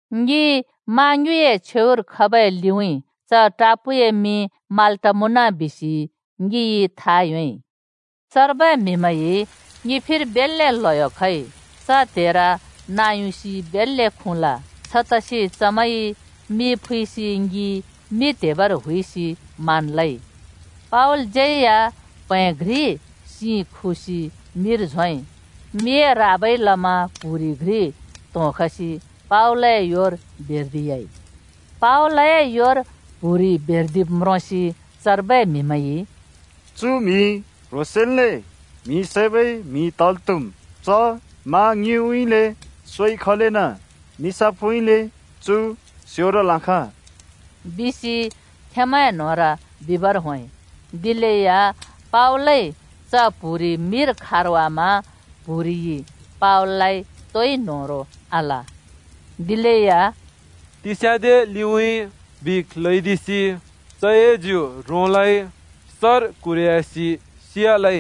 ङि मा ङ्युँइए छेउर खबै लिउँइँ च टापूए मिं माल्‍टा मुँन बिसि ङिइ था योंइ। चर्बै म्‍हिमैंइ ङि फिर बेल्‍ले ल्हयो खइ। च त्हेर नाँ युसि बेल्‍ले खुँल। छतसि चमैंइ मि फुइसि ङि मि त्‍हेबर हुइसि मान लइ। पावलज्यै या प्हैं घ्रि सिं खुसि मिर झोंइ। मिए राबाइ लमा प्‍हुरि घ्रि त्होंखसि पावलए योर बेर्दि‍याइ। पावलए योर प्‍हुरि बेर्दिब् म्रोंसि चर्बै म्‍हिमैंइ, “चु म्‍हि क्ह्रोंसेंन्ले म्हि सैबै म्हि तल् त्‍हुम्! च मा ङ्युँइउँइँले सोइ खलेना निसाफउँइँले चु स्योरल् आखाँ,” बिसि खेंमैंए न्होंर बिबर होंइ। दिलेया पावलइ च प्हुरि मिर खारवामा प्हुरिइ पावललाइ तोइ न्होह्रों आल। दिलेया “तिस्याँदे लिउँइँ बिख ल्‍हैदिसि चए ज्यु रोंलै, सर क्हुरह्‍यासि सियालै,”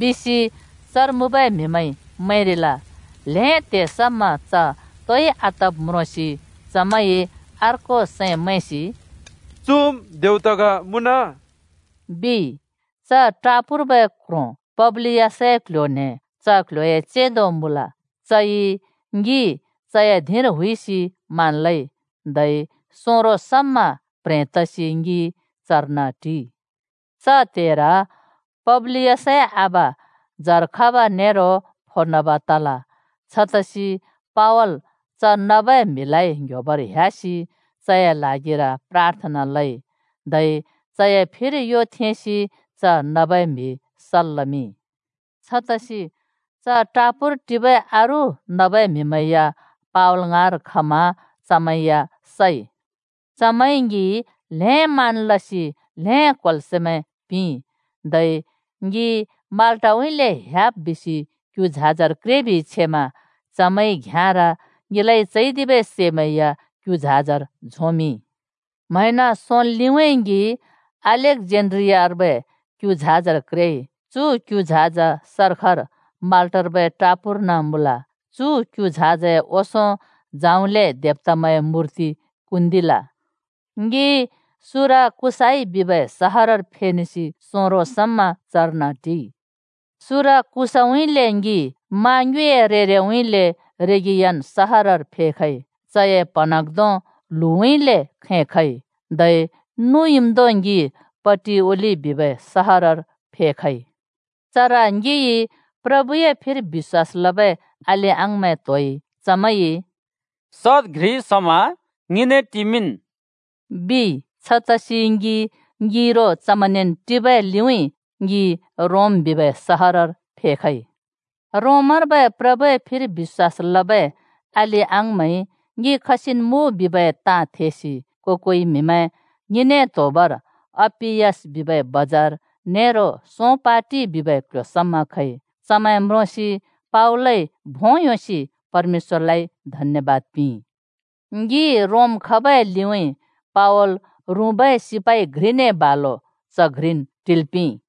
बिसि चर मुँबै म्हिमैंइ मैंरिल। ल्हें त्हे समा च तोइ आतब् म्रोंसि चमैंइ अरू सैंन् मैंसि “चुम् देवता ग मुँन!” बिइ। च टापूर्बै क्ह्रों पब्‍लियसए क्ल्ह्‍यो-न्हें च क्ल्ह्‍योए चेंदो मुँल। चइ ङि चए धिंर हुइसि मान लइ। धै सोंरो समा प्‍ह्रें तसि ङि चर्न टिइ। च त्हेर पब्‍लियसए आबा जर खब नेरो फो नब तल। छतसि पावल च नबै म्‍हिलाइ ङ्‍ह्‍योबर ह्‍यासि चए ल्हागिर प्राथना लइ, धै चए फिर यो थेंसि च नबै म्हि सल् लमिंइ। छतसि च टापूर टिबै अरू नबै म्हिमैं या पावल ङाँर खमा चमैं या सइ। चमैंइ ङि ल्‍हें मान लसि ल्हें क्होल्सैंमैं पिंइ। धै ङि माल्‍टाउँइँले ह्‍याब् बिसि क्यु झाजर क्रेबि छेमा चमैंइ घ्‍याँर ङिलाइ चैदिबै सैमैं या क्यु झाजर झोंमिंइ। म्हैंन सोंल् लिउँइँ ङि अलेक्जेन्ड्रियार्बै क्यु झाजर क्रेइ। चु क्यु झाज सर्खर माल्टर्बै टापूर्न मुँल। चु क्यु झाजए ओंसों जौंले देवतामैंए मूर्ति कुन्दिल। ङि सुराकुसाइ बिबै सहरर फेनेसि सोंरो समा चर्न टिइ। सुराकुसाइउँइँले ङि मा ङ्युँइए छेउ-छेउउँइँले रेगियन सहरर फेखइ। चए प्हँन्हाँग्धों ल्हुँउँइँले (दक्षिणउँइँले) खैं खइ, धै नुयुँम्धों ङि पटिओलि बिबै सहरर फेखइ। चर ङिइ प्रभुए फिर बिश्‍वास लबै अलि-अङाँमैं त्होइ। चमैंइ “सद घ्रि समा ङिने टिमिंन्” बिइ। छतसि ङि ङिरो चमैंनेन् टिबै लिउँइँ ङि रोम बिबै सहरर फेखइ। रोमर्बै प्रभुए फिर बिश्‍वास लबै अलि-अङाँमैंइ ङि खसिन् मुँ बिबै ताँ थेसि को-कोइ म्हिमैं ङिने त्होबर अप्‍पियस बिबै बजार नेरो सों पाटि बिबै क्ल्ह्‍यो समा खइ। चमैं म्रोंसि पावलइ भों योंसि परमेश्‍वरलाइ धन्यबाद पिंइ। ङि रोम खबै लिउँइँ पावल रुँबै सिपाइ घ्रिने बालो च घ्रिन् टिल् पिंइ।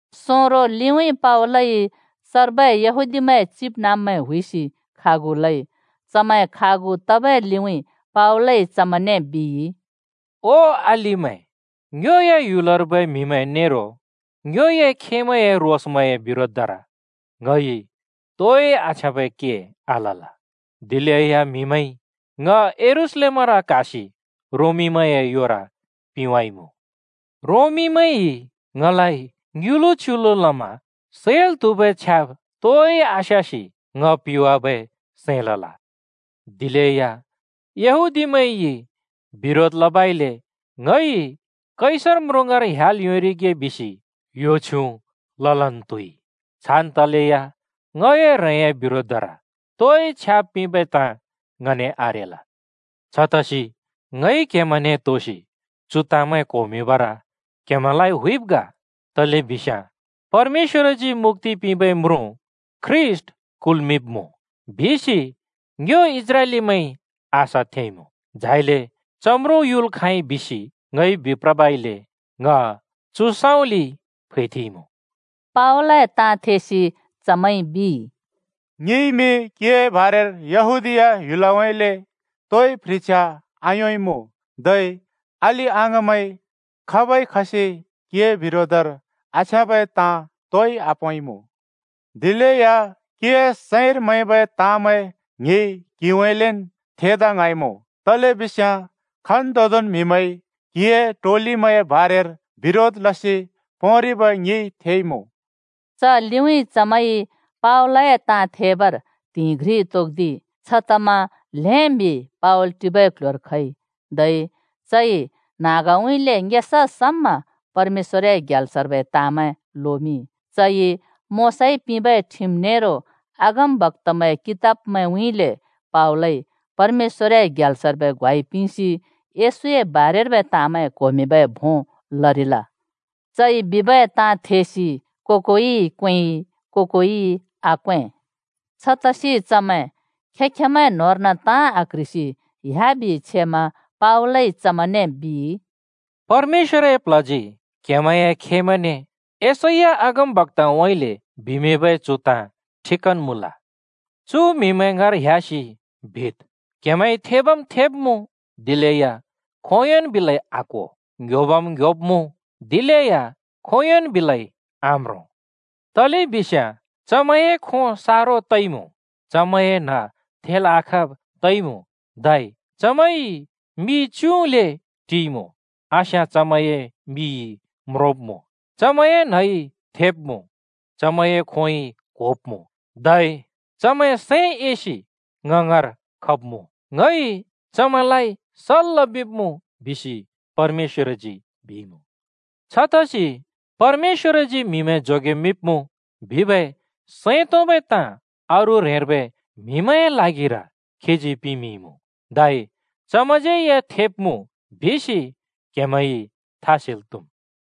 सोंरो लिउँइँ पावलइ चर्बै यहूदीमैंए चिबनाँब्मैं हुइसि खागु लइ। चमैं खागु तबै लिउँइँ पावलइ चमैंने बिइ, “ओ अलिमैं, ङ्योए ह्‍युलर्बै म्हिमैं नेरो ङ्योए खेमैंए रोसमैंए बिरोधर ङइ तोइ आछ्याँबै के आलल। दिलेया म्हिमैंइ ङ यरूशलेमर क्हासि रोमीमैंए योर पिंवाइमुँ। रोमीमैंइ ङलाइ ङ्युलु च्युलु लमा सैल् त्हुबै छ्याब् तोइ आस्यासि ङ पिवाबै सैं लल। दिलेया यहूदीमैंइ बिरोध लबइले ङइ कैसर म्रुँ ङाँर ह्‍याल् योंरिगे बिसि यो छ्युँ ललन् त्हुइ। छान् तलेया ङए ह्रेंए बिरोधर तोइ छ्याब् पिंबै ताँ ङने आरेल। छतसि ङइ क्हेमैंने त्होसि चु ताँमैं क्होमिंबर क्हेमैंलाइ हुइब् ग। तलेबिस्याँ ‘परमेश्‍वरजी मुक्‍ति पिंबै म्रुँ ख्रीष्‍ट कुल्मिंब्मुँ,’ बिसि ङ्यो इस्राएलीमैंइ आशा थेंइमुँ। झाइले च म्रुँ युल् खाँइ बिसि ङइ बिप्रबइले ङ चु सँउँलिइ फैथेंइँमुँ।” पावलए ताँ थेसि चमैंइ बिइ, “ङिइमि क्हिए बारेर यहूदीया ह्‍युलउँइँले तोइ प्ह्रिछ्या आयोंइँमुँ। धै अलि-अङाँमैं खाबै खसि क्हिए बिरोधर आछ्याँब ताँ तोइ आपोंइँमुँ। दिलेया क्‍हिए सैंर मैंबै ताँमैं ङिइ क्हिउँइँलेन् थेदा ङ्हाँइँमुँ, तलेबिस्याँ खन्तोदोंन् म्हिमैंइ क्हिए टोलिमैंए बारेर बिरोध लसि पोंरिब ङिइ थेइमुँ।” च लिउँइँ चमैंइ पावलए ताँ थेबर त्हिंइ घ्रि तोक्दिइ। छतमा ल्हें म्हि पावल टिबै क्ल्ह्‍योर खइ। धै चइ न्हाँगउँइँले ङेसा समा परमेश्‍वरए ग्याल्सर्बै ताँमैं लोमिंइ। चइ मोशाइ पिंबै ठिम नेरो अगमबक्‍तामैंए कितबमैंउँइँले पावलइ परमेश्‍वरए ग्याल्सर्बै ग्वाइ पिंसि यशूए बारेर्बै ताँमैं क्होमिंबै भों लरिल। चइ बिबै ताँ थेसि को-कोइइ क्वेंइ, को-कोइइ आक्वें। छतसि चमैं खें-खेंमैंन् ताँ आक्‍ह्रिसि ह्‍याबि छेमा पावलइ चमैंने बिइ, “परमेश्‍वरए प्ल्हजी क्हेमैंए खेमैंने यशैया अगमबक्‍ताउँइँले बिमिंबै चु ताँ ठिकन् मुँल, चु म्‍हिमैं ङाँर ह्‍यासि बिद्, ‘क्हेमैंइ थेबम् थेब्मुँ, दिलेया खोंयोंन् बिलै आक्‍हो; ङ्ह्‍योबम् ङ्ह्‍योब्मुँ, दिलेया खोंयोंन् बिलै आम्रों।’ तलेबिस्याँ चमैंए खों सारो तइमुँ, चमैंए न्ह थेल् आखाँब् तइमुँ, धै चमैंइ मि च्‍युँल्‍ले टिइमु। आस्याँ चमैंए मिइ म्रोंब्मुँ, चमैंए न्हइ थेब्मुँ, चमैंए खोंइ क्होब्मुँ, धै चमैं सैं एसि ङ ङाँर खब्मुँ, ङइ चमैंलाइ सल् लमिंब्मुँ बिसि परमेश्‍वरजी बिइमुँ। छतसि ‘परमेश्‍वरजी म्हिमैं जोगेमिंब्‍मुँ,’ बिबै सैं तोंबै ताँ अरू ह्रेंर्बै म्हिमैंए ल्हागिर खीजी पिमिंइँमुँ, धै चमैंज्यै थेब्‍मुँ, बिसि क्‍हेमैं था सेल् त्‍हुम्।”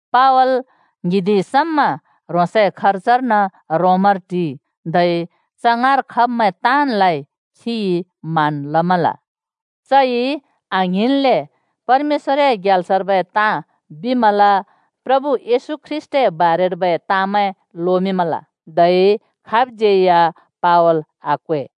पावल ङ्हिंदि समा ह्रोंसए खर्जर्न रोमर टिइ, धै च ङाँर खब्मैं ताँनलाइ खिइ मान लमल। चइ आङ्हिंनले परमेश्‍वरए ग्याल्सर्बै ताँ बिमल, प्रभु येशू ख्रीष्‍टए बारेर लोमिंमल, धै खाब्ज्यै या पावल आक्वै।